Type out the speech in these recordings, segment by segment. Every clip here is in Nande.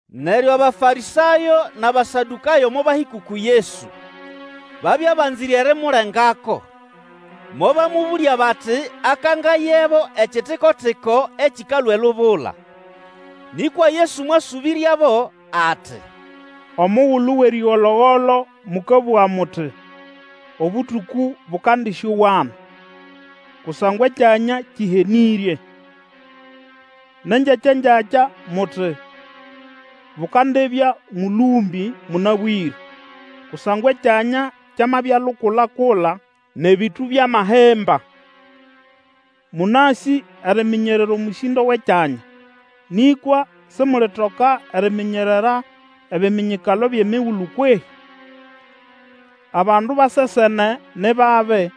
Neryo Abafarĩsayo nʼAbasadũkayo mobahĩka uku Yesu. Babya banzĩre erimulengako, mobamũbũlya bati akangayebo ekitiko-tiko ekĩkalũa elubula. Nĩkwa Yesu mwasũbĩryabo, ati, Omugulu wʼerĩgolo-golo mũkabũga muti, Obũtũkũ bũkandĩsyowana, kusangwa ekyanya kĩhenĩrye. Nʼengyakya-ngyakya muti, Bukandibya mũlũmbĩ mũnabwĩre, kusangwa ekyanya kyamabya lukula-kula nʼebĩtũ byamahimba. Mũnasĩ eriminyerera omũsĩndo wʼekyanya, nĩkwa simulitoka eriminyerera ebiminyikalo byʼemigulu kwehĩ? Abandu ba sesene ni babi,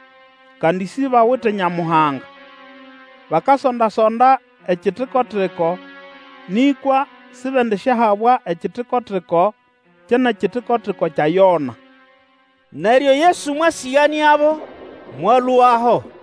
kandi sibawite Nyamuhanga, bakasonda-sonda ekitiko-tiko, nĩkwa sibendisyahabwa ekitiko-tiko kye nʼekitiko-tiko kya Yona. Neryo Yesu mwasĩganĩabo, mwalũaho.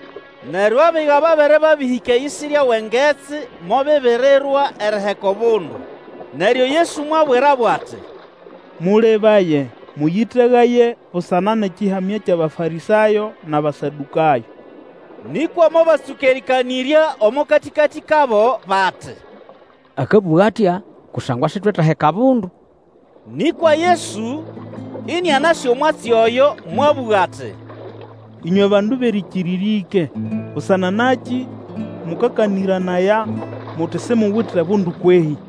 Neryo abiga babere babĩhĩka eyisirya wʼengetsi mobibirirwa eriheka obundu. Neryo Yesu mwabwirabo ati, Mũlebaye, mũyĩtegaye busana nʼekĩhamya kyʼAbafarĩsayo nʼAbasadũkayo. Nĩkwa mobatsũka erĩkanĩrya omo katĩkatĩ kabo bati, akabũga atya kusangwa sitwetaheka bundu. Nĩkwa Yesu, ĩnĩanasĩ omwatsi oyo mwabũga ati, Ĩnywe bandu bʼerĩkĩrĩrya ĩke, busana nakĩ mũkakanĩranaya muti simuwite bundu kwehĩ?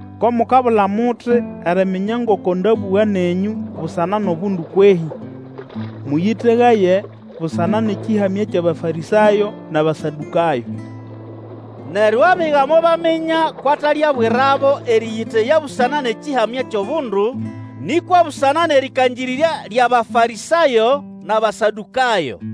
Ko mukabula muti eriminya ngoko ndabũga nenyũ busana nʼobundu kwehĩ? Mũyĩtegaye busana nʼekĩhamya kyʼAbafarĩsayo nʼAbasadũkayo! Neryo abiga mobaminya kwʼatalyabwirabo erĩyĩteya busana nʼekĩhamya kyʼobundu, nĩkwa busana nʼerĩkangĩrĩrya lyʼAbafarĩsayo nʼAbasadũkayo.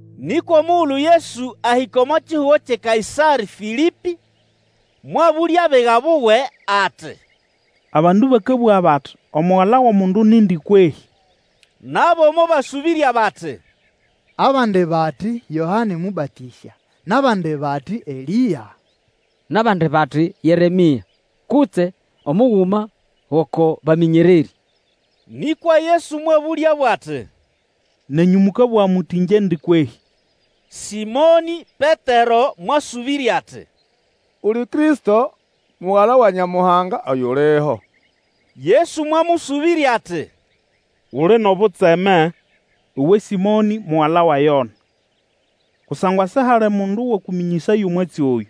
Nĩkwa omugulu Yesu ahĩka omo kihugo kyʼeKaĩsarĩ-Fĩlĩpĩ, mwabũlya abiga buwe ati, Abandu bakabũga bati, Omugala wʼomundu yondi kwehĩ? Nabo mobasũbĩrya bati, Abandi bati, Yoane Mũbatĩsya; nʼabandi bati, Elĩa; nʼabandi bati, Yeremĩa, kutse omuguma gʼoko bamĩnyererĩ. Nĩkwa Yesu mwabũlyabo ati, Nenyũ mũkabũga muti Ĩngyendi kwehĩ? Sĩmonĩ Petero mwasũbĩrya ati, Uli Kristo, Mugala wa Nyamuhanga oyuliho. Yesu mwamũsũbĩrya ati, Uli nʼobutseme, uwe Sĩmonĩ mugala wa Yona! Kusangwa sihali mundu wakũmĩnyĩsaya omwatsi oyũ,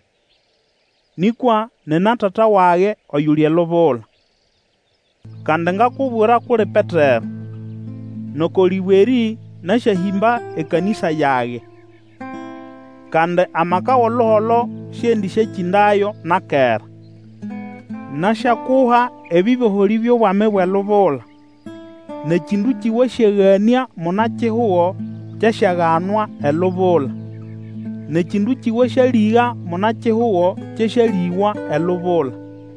nĩkwa nina Tata wage oyuli elubula. Kandi ngakubwira kʼuli Petero, nʼoko lĩbwe erĩ nasyahĩmba ekanĩsa yage; kandi amaka wʼoluholo siendĩsyakĩndayo na kera. Nasyakuha ebĩboholĩ byʼobwami bwʼelubula, nʼekĩndũkĩ wasyaganĩa muna-kihugo, kyasyaganwa elubula, nʼekĩndũkĩ wasyalĩga muna-kihugo kyasyalĩgwa elubula.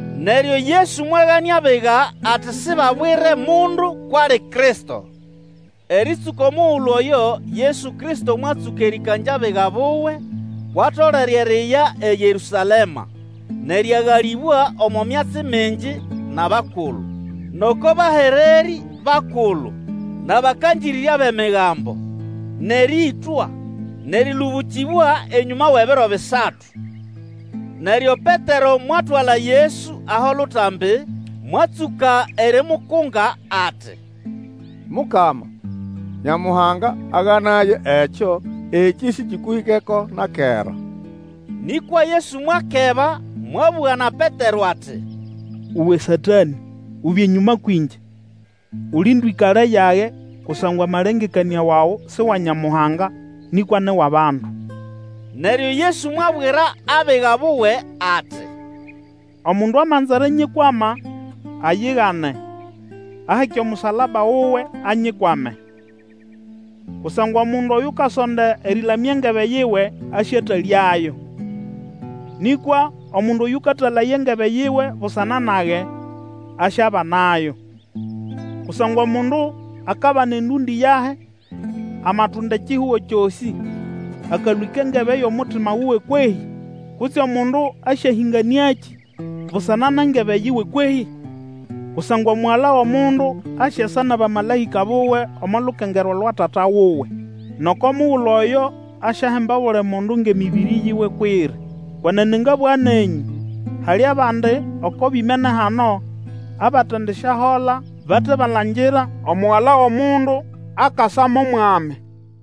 Neryo Yesu mwaganĩa abiga ati sibabwire mundu kwʼali Kristo. Erĩtsũka omugulu oyo Yesu Kristo mwatsũka erĩkangya abiga buwe kwʼatolere eriya eYerũsalema, nʼerĩagalĩbwa omo myatsi mingi nʼabakulu, nʼoko bahererĩ bakulu, nʼabakangĩrĩrya bʼEmigambo, nʼerĩĩtwa, nʼerĩlũbũkĩbwa enyũma wʼebiro bisatu. Neryo Petero mwatwala Yesu aho lutambi, mwatsũka erimukunga ati, Mukama, Nyamuhanga aganaye ekyo! Ekĩ sĩkĩkũhĩkeko na kera! Nĩkwa Yesu mwakeba mwabũga na Petero ati, Uwe Satanĩ, ubye enyũma kwĩngye! Uli ndwĩkale yage kusangwa amalengekanĩa wawe si wa Nyamuhanga nĩkwa ni wʼabandu. Neryo Yesu mwabwira abiga buwe ati, Omundu amanza erinyikwama, ayigane, aheke omusalaba wuwe, anyikwame. Kusangwa omundu Oyukasonda erĩlamya engebe yiwe asyatalyayo; nĩkwa omundu Oyũkatalaya engebe yiwe busana nage, asyabanayo. Kusangwa omundu akabana endũndĩ yahi amatunda ekihugo kyosĩ, akalwĩka engebe yʼomutima wuwe kwehĩ? Kutse omundu asyahĩnganĩakĩ busana nʼengebe yiwe kwehĩ? Kusangwa Omugala wʼomundu asyasa nʼabamalaĩka buwe omo lukengerwa lwa Tata wuwe; nʼoko mugulu oyo asyahemba obuli mundu ngʼemĩbĩrĩ yiwe kwʼiri. Kwenene ngabũga nenyũ, hali abandi oko bimene hano abatendisyahola bate balangira Omugala wʼomundu akasa mo Mwami.